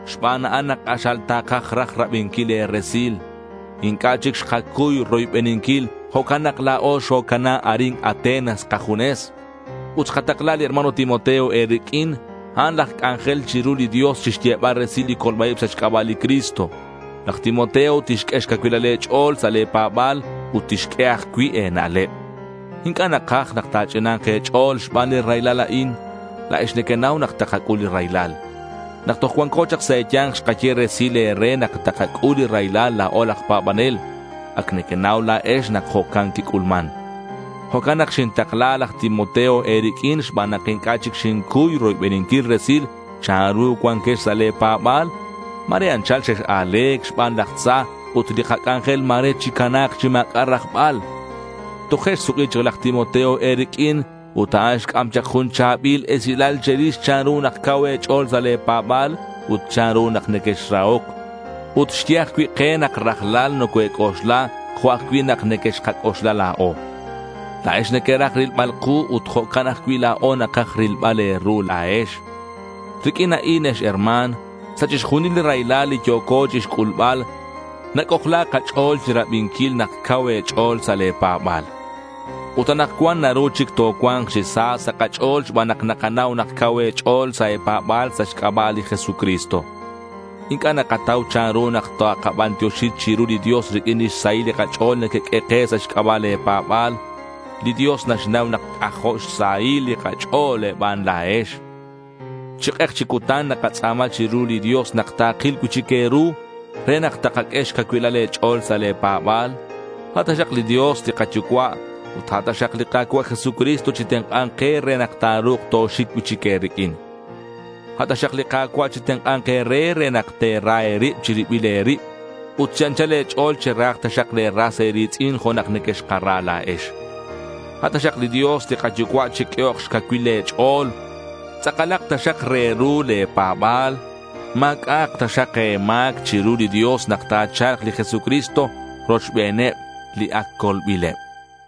Xban a'an nak k'axal takaj raj rabinquil e̱resil. Inc'a' chic xkacuy roybeninquil. Jo'can nak la̱o xocana arin Atenas kajunes. Ut xkatakla li hermano Timoteo e̱riq'uin. A'an laj c'anjel chiru li Dios chixyebal resil li colba-ib sa' xc'aba' li Cristo. Laj Timoteo tixq'ue xcacuilal e̱ch'o̱l sa' le̱ pa̱ba̱l ut tixq'ue ajcui' e̱na'leb. Inc'a' nakaj nak ta̱ch'ina̱k e̱ch'o̱l xban li raylal a'in. La̱ex nequenau nak takac'ul li raylal. Nak toj cuanco chak sa' e̱ya̱nk xkaye resil e̱re nak takac'ul li raylal la̱o aj pa̱banel. Ac nequenau la̱ex nak jo'can quic'ulman. Jo'can nak xintakla laj Timoteo e̱riq'uin xban nak inc'a' chic xincuy roybeninquil resil chanru cuanquex sa' le̱ pa̱ba̱l. Ma̱re anchal xex-a̱le̱c xban laj tza ut li kac'anjel ma̱re chicana̱k chi ma̱c'a' rajbal. Toje' xsuk'i chak laj Timoteo e̱riq'uin ut a'an xc'am chak jun cha̱bil esilal che̱rix chanru nak cau e̱ch'o̱l sa' le̱ pa̱ba̱l ut chanru nak nequexrahoc. Ut xye ajcui' ke nak rajlal nocoe̱c'oxla jo' ajcui' nak nequexkac'oxla la̱o. La̱ex nequeraj rilbal ku ut jo'can ajcui' la̱o nakaj rilbal e̱ru la̱ex. Riq'uin a'in, ex herma̱n, sa' chixjunil li raylal li yo̱co chixc'ulbal, nac'ojla kach'o̱l chirabinquil nak cau e̱ch'o̱l sa' le̱ pa̱ba̱l. Ut anakcuan naru chic tocua̱nk chi sa sa' kach'o̱l xban nak nakanau nak cau e̱ch'o̱l sa' e̱pa̱ba̱l sa' xc'aba' li Jesucristo. Inc'a' nakatau chanru nak takabantioxi chiru li Dios riq'uin lix sahil li kach'o̱l nequeq'ue ke sa' xc'aba' le̱ pa̱ba̱l. Li Dios naxnau nak c'ajo' xsahil li kach'o̱l e̱ban la̱ex. Chi k'ek chi cutan nakatz'a̱ma chiru li Dios nak takil cui'chic e̱ru re nak takaq'ue xcacuilal e̱ch'o̱l sa' le̱ pa̱ba̱l. A' taxak li Dios li kaYucua' ut a' taxak li Ka̱cua' Jesucristo chitenk'a̱nk ke re nak ta̱ru̱k toxic cui'chic e̱riq'uin. A' taxak li Ka̱cua' chitenk'a̱nk e̱re re nak te̱ra e̱rib che̱ribil e̱rib ut chi anchal e̱ch'o̱l cherahak taxak le̱ ras e̱ri̱tz'in jo' nak nequexkara la̱ex. A' taxak li Dios li kaYucua' chiq'uehok xcacuil e̱ch'o̱l. Tz'akalak taxak re ru le̱ pa̱ba̱l. Ma̱c'a'ak taxak e̱ma̱c chiru li Dios nak ta̱cha̱lk li Jesucristo rochbeneb li ac colbileb.